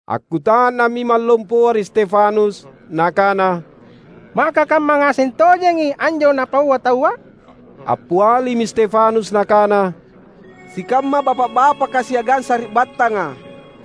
Akkuta’nammi imang lompoa ri Stefanus, nakana, "Maka kamma ngaseng tojengi anjo napaua taua?" Appialimi Stefanus nakana, "Sikamma bapa’-bapaka siagang sari’battanga!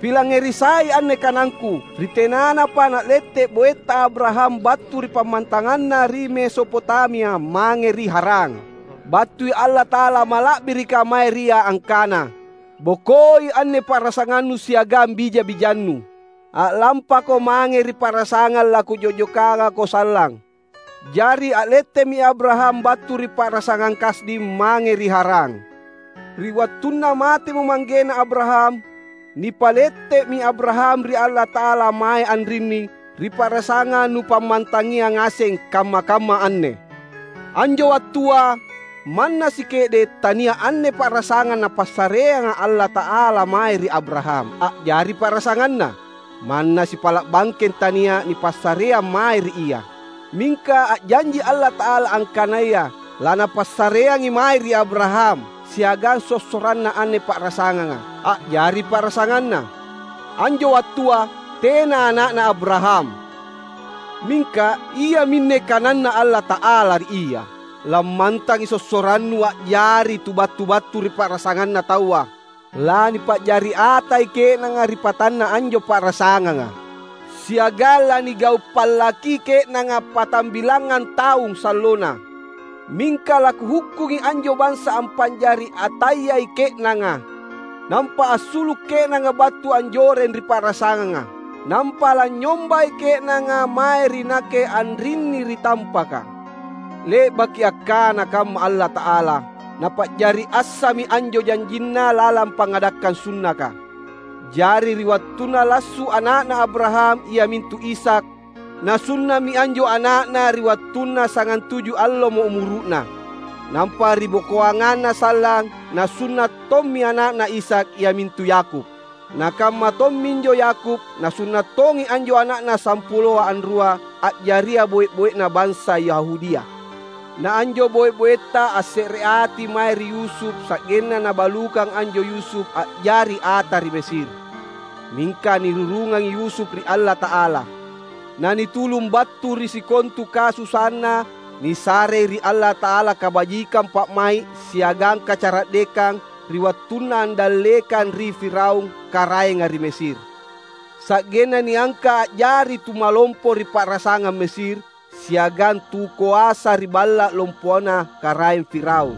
Pilangngeri sai anne kanangku! Ri tenanapa na’lette’ boeta Abraham battu ri pammantanganna ri Mesopotamia mange ri Haran, battui Allata’ala mala’birika mae ri ia, angkana, ‘Bokoi anne pa’rasangannu siagang bija-bijannu. A’lampako mange ri pa’rasangang laKujo’jokangako sallang.’ Jari a’lette’mi Abraham battu ri pa’rasangang Kasdim mange ri Haran. Ri wattunna matemo manggena Abraham, nipalette’mi Abraham ri Allata’ala mae anrinni, ri pa’rasangang nupammantangia ngaseng kamma-kamma anne. Anjo wattua, manna sike’de’ tania’ anne pa’rasanganga Napassareanga Allata’ala mae ri Abraham a’jari pa’rasanganna; manna sipala’ bangkeng tania’ nipassareang mae ri ia. Mingka a’janji Allata’ala angkanaya laNapassareangi mae ri Abraham siagang sossoranna anne pa’rasanganga, a’jari pa’rasanganna. Anjo wattua tena ana’na Abraham. Mingka iaminne kananNa Allata’ala ri ia, ‘Lammantangi sossorannu a’jari tu battu-battu ri pa’rasanganna taua. Lanipa’jari atai ke’nanga ri patanna anjo pa’rasanganga, siagang lanigau’ pallaki ke’nanga patambilangngang taung sallona. Mingka laKuhukkungi anjo bansa ampa’jari atayai ke’nanga, nampa assulu’ ke’nanga battu anjoreng ri pa’rasanganga. Nampa lanynyombai ke’nanga mae ri Nakke anrinni ri tampaka.’ Le’baki akkana kamma Allata’ala, Napa’jari assami anjo janjinNa lalang pangngadakkang sunnaka. Jari ri wattunna lassu’ ana’na Abraham, iamintu Ishak, nasunna’mi anjo ana’na ri wattunna sagantuju allomo umuru’na. Nampa ribokoanganna sallang nasunna’ tommi ana’na Ishak, iamintu Yakub. Nakamma tomminjo Yakub, nasunna’ tongi anjo ana’na sampuloa anrua, a’jaria boe-boena bansa Yahudia. Na anjo boe-boeta assereati mae ri Yusuf, sa’genna nabalukang anjo Yusuf a’jari ata ri Mesir. Mingka nirurungangi Yusuf ri Allata’ala, nanitulung battu ri sikontu kasusaanna. Nisarei ri Allata’ala kabajikang pa’mai’ siagang kacara’dekang ri wattunna andallekang ri Firaun karaenga ri Mesir. Sa’genna niangka’ a’jari Tumalompo ri pa’rasangang Mesir, siagang tukoasa ri Balla’ Lompona Karaeng Firaun.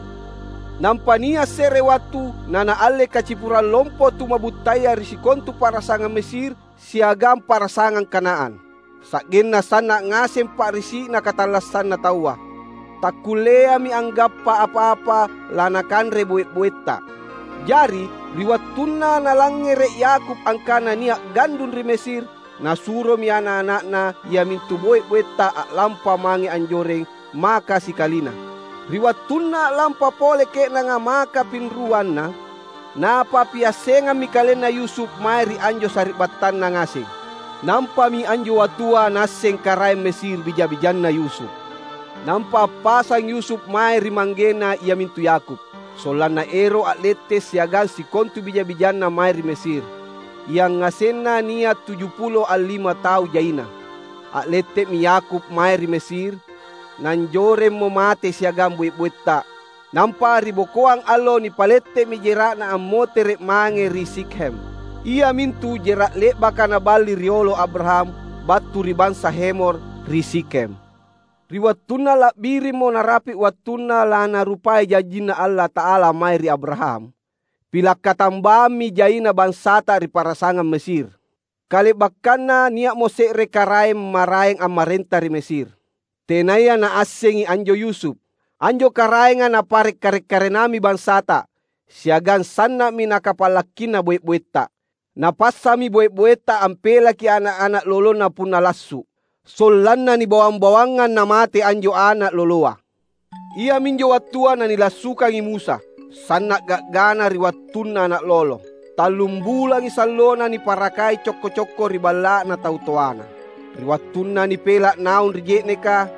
Nampa nia’ se’re wattu nanaalle kacipurang lompo tuma’buttaya ri sikontu pa’rasangang Mesir siagang pa’rasangang Kanaan, sa’genna sanna’ ngaseng pa’risi’na katallassanna taua. Takkulleami anggappa apa-apa lanakanre boe-boeta. Jari ri wattunna nalangngere’ Yakub angkana nia’ gandung ri Mesir nasuromi ana’-ana’na, iamintu boe-boeta a’lampa mange anjoreng, maka sikalina. Ri wattunna a’lampa pole ke’nanga maka pinruanna, napappiassengammi kalenna Yusuf mae ri anjo sari’battanna ngaseng. Nampami anjo wattua naasseng karaeng Mesir bija-bijanna Yusuf. Nampa appasang Yusuf mae ri manggena, iamintu Yakub, sollanna ero’ a’lette’ siagang sikontu bija-bijanna mae ri Mesir — yangasenna nia’ tujupulo allima tau jaina. A’lette’mi Yakub mae ri Mesir. Nanjoremmo mate siagang boe-boeta. Nampa ri bokoang allo nipalette’mi jera’na ammotere’ mange ri Sikhem, iamintu jera’ le’baka naballi riolo Abraham battu ri bansa Hemor ri Sikhem. Ri wattunna la’birimmo narapi’ wattunna laNarupai janjinNa Allata’ala mae ri Abraham, pila’ katambammi jaina bansata ri pa’rasangang Mesir. Kale’bakkanna nia’mo se’re karaeng maraeng ammarenta ri Mesir, tenaya naassengi anjo Yusuf. Anjo karaenga napare’ karek-karenammi bansata, siagang sanna’mi nakapallakkina boe-boeta. Napassami boe-boeta ampelaki ana’-ana’ lolona punna lassu’ sollanna nibawang-bawangngang na mate anjo ana’ loloa. Iaminjo wattua nanilassukangi Musa; sanna’ ga’gana ri wattunna ana’ lolo. Tallum bulangi sallona niparakai cokko-cokko ri balla’na tau toana; ri wattunna nipela’ naung ri je’neka,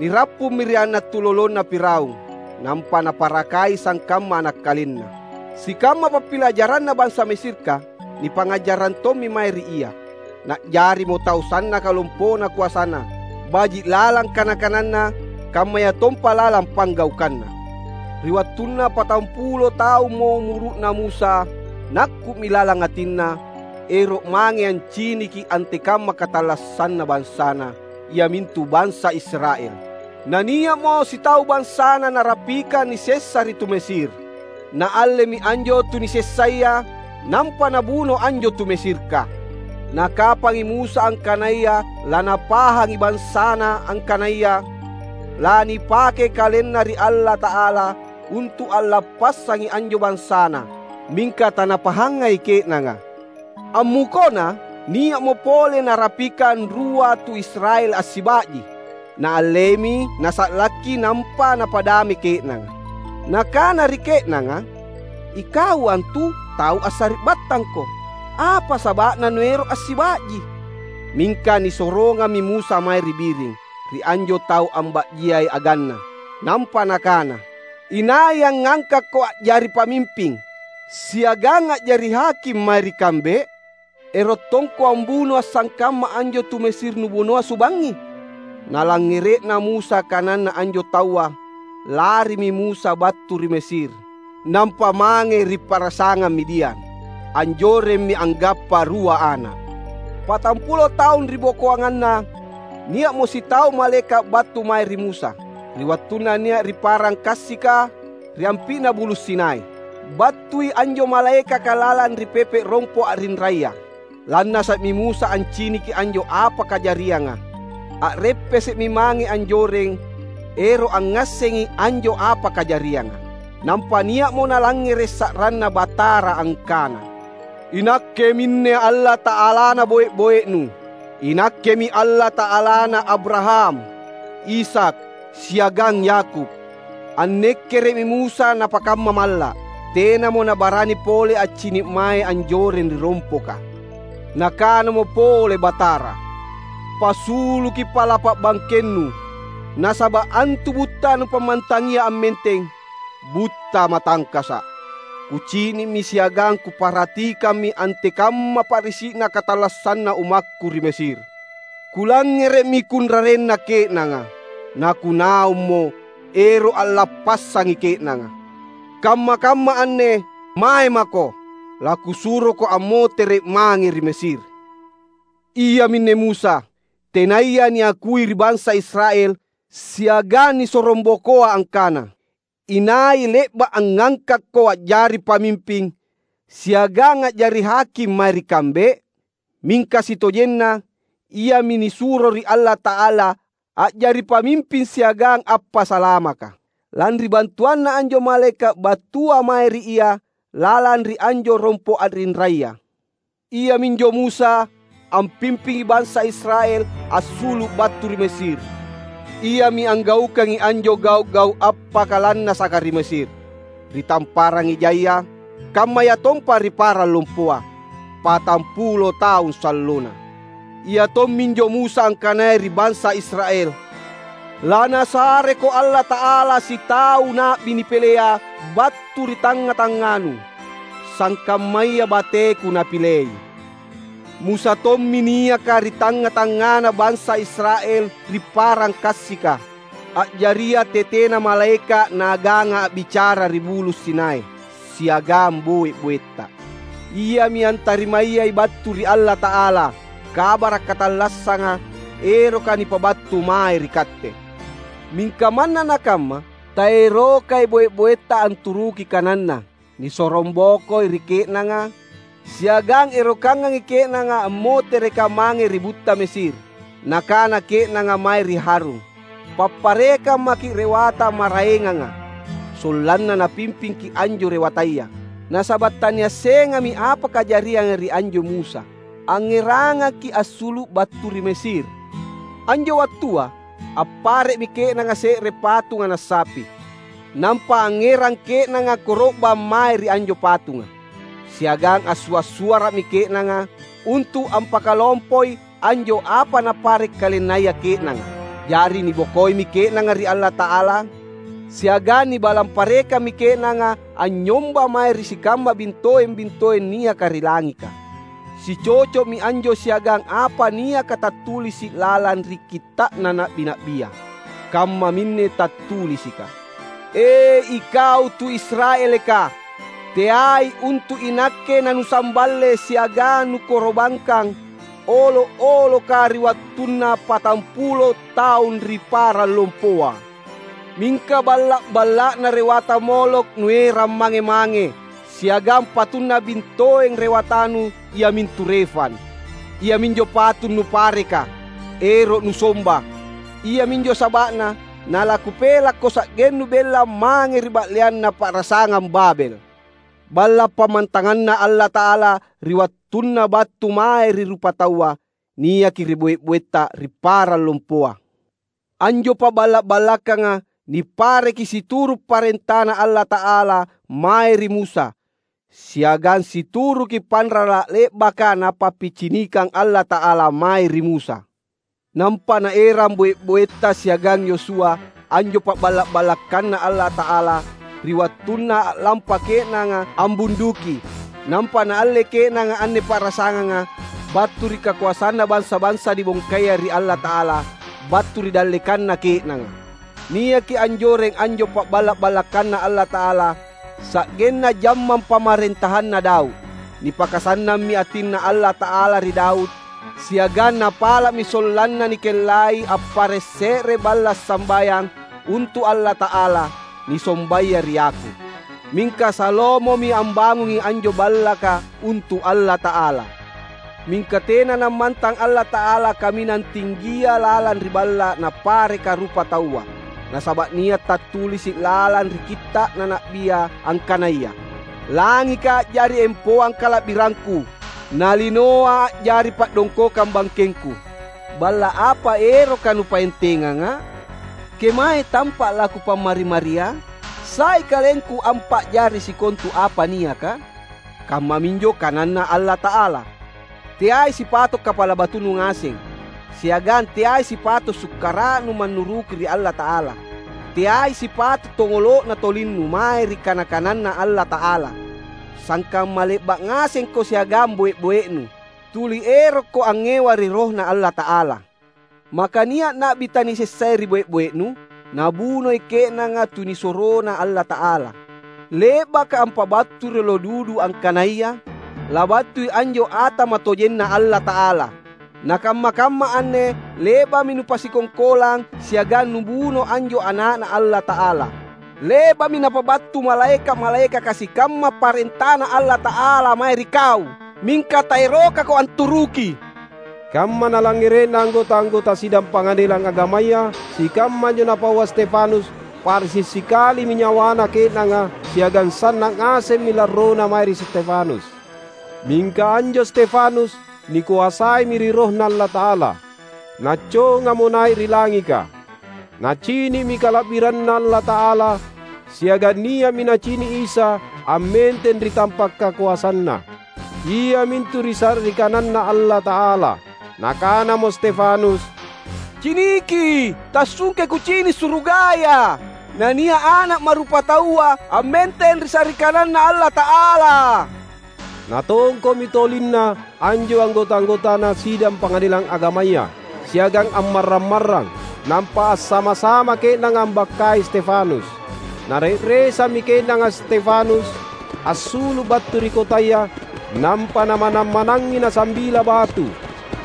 nirappummi ri ana’ tulolona Firaun, nampa naparakai sangkamma ana’ kalenna. Sikamma pappilajaranna bansa Mesirka nipangngajarrang tommi mae ri ia. Na’jarimo tau sannaka lompona koasana, baji’ lalang kana-kananna kammayatompa lalang panggaukanna. Ri wattunna patampulo taummo umuru’na Musa, nakku’mi lalang atinna, ero’ mange anciniki antekamma katallassanna bansana, iamintu bansa Israel. Na nia’mo sitau bansana narapikang nisessa ri tu Mesir; naallemi anjo tu nisessaya, nampa nabuno anjo tu Mesirka. Nakapangi Musa angkanaya lanapahangi bansana angkanaya lanipakei kalenna ri Allata’ala untu’ allappassangi anjo bansana. Mingka tanapahangai ke’nanga. Ammukona nia’mo pole narapikang rua tu Israel assiba’ji. Naallemi nasa’lakki nampa napa’dame ke’nanga. Nakana ri ke’nanga, ‘Ikau antu tau assari’battangko. Apa saba’na nuero’ assiba’ji?’ Mingka nisorongammi Musa mae ri biring, ri anjo tau amba’jiai aganna, nampa nakana, ‘Inai angngangkakko a’jari pamimping siagang a’jari haking mae ri kambe? Erottongko ambunoa’ sangkamma anjo tu Mesir nubunoa subangngi?’ Nalangngere’na Musa kananna anjo taua, larimi Musa battu ri Mesir, nampa mange ri pa’rasangang Midian. Anjoremmi anggappa rua ana’. Patampulo taung ribokoanganna, nia’mo sitau malaeka’ battu mae ri Musa, ri wattunna nia’ ri parang kassika, ri ampi’na Bulu’ Sinai. Battui anjo malaekaka lalang ri pepe’ rompo’ a’rinraya. Lannasa’mi Musa anciniki anjo apa kajarianga. A’reppese’mi mange anjoreng ero’ angngassengi anjo apa kajarianga. Nampa nia’mo nalangngere’ sa’ranNa Batara angkana, ‘INakke minne Allata’alana boe-boenu; iNakkemi Allata’alana Abraham, Ishak, siagang Yakub.’ Annekkere’mi Musa napakamma malla’. Tenamo nabarani pole accini’ mae anjoreng ri rompoka. Nakanamo pole Batara, ‘Pasuluki pa’la’pa’ bangkennu, nasaba’ antu butta nupammantangia ammenteng, butta matangkasa’. Kucini’mi siagang Kuparhatikammi antekamma pa’risi’na katallassanna ummakKu ri Mesir. Kulangngere’mi kunrarenna ke’nanga, naKunaummo ero’ allappassangi ke’nanga. Kamma-kamma anne, mae mako! LaKusuroko ammotere’ mange ri Mesir.’ Iaminne Musa, tenaya niakui ri bansa Israel, siagang nisorongbokoa angkana, ‘Inai le’ba’ angngangkakko a’jari pamimping siagang a’jari haking mae ri kambe?’ Mingka sitojenna, iami nisuro ri Allata’ala a’jari pamimping siagang appasalamaka, lanri bantuanna anjo malaeka’ battua mae ri ia lalang ri anjo rompo’ a’rinraya. Iaminjo Musa ampimpingi bansa Israel assulu’ battu ri Mesir; iami anggaukangi anjo gau’-gau’ appakalannasaka ri Mesir, ri Tamparang Ejaya, kammayatompa ri parang lompoa patampulo taung sallona. Ia tomminjo Musa angkanaya ri bansa Israel, ‘LaNasareko Allata’ala sitau na’bi nipilea battu ri tangnga-tangnganu, sangkammaya bateku Napilei.’ Musa tommi niaka ri tangnga-tangngana bansa Israel ri parang kassika, a’jaria tetena malaeka’ naaganga a’bicara ri Bulu’ Sinai siagang boe-boeta. Iami antarimayai battu ri Allata’ala kabara’ katallassanga eroka nipabattu mae ri katte. Mingka manna nakamma, taerokai boe-boeta anturuki kananna. Nisorongbokoi ri ke’nanga, siagang erokangangi ke’nanga ammotereka mange ri butta Mesir. Nakana ke’nanga mae ri Harun, ‘Papparekang maki’ rewata maraenganga, sollanna napimpingki’ anjo rewataya. Nasaba’ taniassengami apa kajarianga ri anjo Musa, angngerangaki’ assulu’ battu ri Mesir!’ Anjo wattua appare’mi ke’nanga se’re patung ana’ sapi. Nampa angngerang ke’nanga koro’bang mae ri anjo patunga; siagang assua’-suara’mi ke’nanga untu’ ampakalompoi anjo apa napare’ kalennaya ke’nanga. Jari nibokoimi ke’nanga ri Allata’ala siagang nibalang parekammi ke’nanga anynyomba mae ri sikamma bintoeng-bintoeng niaka ri langika. Sicoco’mi anjo siagang apa niaka tattulisi’ lalang ri kitta’na na’bi-na’bia. Kammaminne tattulisika, ‘E ikau tu Israelka! Teai untu’ iNakke nanusamballe siagang nukoro’bangkang olo’-oloka ri wattunna patampulo taung ri parang lompoa. Mingka balla’-balla’na rewata Molokh nuerang mange-mange siagang patunna bintoeng rewatanu, iamintu Refan; iaminjo patung nupareka, ero’ nusomba. Iaminjo saba’na nalaKupelakko sa’gennu bella mange ri ba’leanna pa’rasangang Babel.’ Balla’ pammantanganNa Allata’ala ri wattunna battu mae ri rupataua niaki ri boe-boeta ri parang lompoa. Anjo pa’balla’-ballakanga nipareki situru’ parentaNa Allata’ala mae ri Musa, siagang situruki panrala’ le’baka Napappicinikang Allata’ala mae ri Musa. Nampa naerang boe-boeta siagang Yosua anjo pa’balla’-ballakanNa Allata’ala ri wattunna a’lampa ke’nanga ambunduki nampa naalle ke’nanga anne pa’rasanganga battu ri kakoasanna bansa-bansa nibongkaya ri Allata’ala battu ri dallekanna ke’nanga. Niaki anjoreng anjo pa’balla’-ballakanNa Allata’ala sa’genna jammang pamarentahanna Daud. Nipakasannammi atinNa Allata’ala ri Daud siagang napala’mi sollanna nikellai appare’ se’re Balla’ Sambayang untu’ Allata’ala, nisombaya ri Yakub. Mingka Salomomi ambangungi anjo ballaka untu’ Allata’ala. Mingka tena nammantang Allata’ala Kaminang Tinggia lalang ri balla’ napareka rupataua; nasaba’ nia’ tattulisi’ lalang ri Kitta’na na’bia angkanaya, ‘Langika a’jari empoang kala’birangKu, na linoa a’jari pa’dongkokang bangkengKu. Balla’ apa eroka nupaentengangA’? Kemae tampa’ laKupammari-maria? Sai KalengKu ampa’jari sikontu apa niaka?’ kammaminjo kananNa Allata’ala. Teai sipato’ kapala batunu ngaseng, siagang teai sipato’ sukkara’nu mannuruki ri Allata’ala! Teai sipato’ tongolo’na tolinnu mae ri kana-kananNa Allata’ala! Sangkamma le’ba’ ngasengko siagang boe-boenu; tuli erokko angngewa ri RohNa Allata’ala! Maka nia’ na’bi tanisessaya ri boe-boenu? Nabunoi ke’nanga tunisuroNa Allata’ala, le’baka ampabattui riolo dudu angkanaya labattui anjo Ata matojenNa Allata’ala. Na kamma-kamma anne le’ba’mi nupasikongkolang siagang nubuno anjo Ana’Na Allata’ala. Le’ba’mi napabattu malaeka’-malaekaka sikamma parentaNa Allata’ala mae ri kau mingka taerokako anturuki!" Kamma nalangngere’na anggota-anggota sidang Pangadelang Agamaya sikamma anjo napaua Stefanus, pa’risi’ sikalimi nyawana ke’nanga siagang sanna’ ngasemmi larrona mae ri Stefanus. Mingka anjo Stefanus nikoasaimi ri RohNa Allata’ala, naccongamo nai’ ri langika. Nacini’mi kala’biranNa Allata’ala, siagang nia’mi nacini’ Isa ammenteng ri tampa’ kakoasanNa, iamintu ri sa’ri kananNa Allata’ala. Nakanamo Stefanus, "Ciniki, tassungkei kucini’ surugaya na nia’ Ana’ Ma’rupataua ammenteng ri sa’ri kananNa Allata’ala!" Natongko’mi tolinna anjo anggota-anggotana sidang pangadelang agamaya, siagang ammarrang-marrang, nampa assama-sama ke’nanga ambakkai Stefanus. Nare’resammi ke’nanga Stefanus assulu’ battu ri kotaya nampa namanang-manangngi nasambila batu.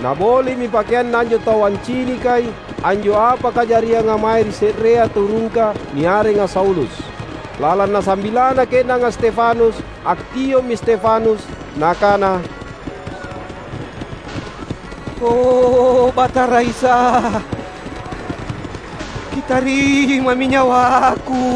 Naboli’mi pakeanna anjo tau ancinikai anjo apa kajarianga mae ri se’rea tu rungka niarenga Saulus. Lalang nasambilana ke’nanga Stefanus, akkio’mi Stefanus, nakana, "O Batara Isa, Kitarimami nyawaku!"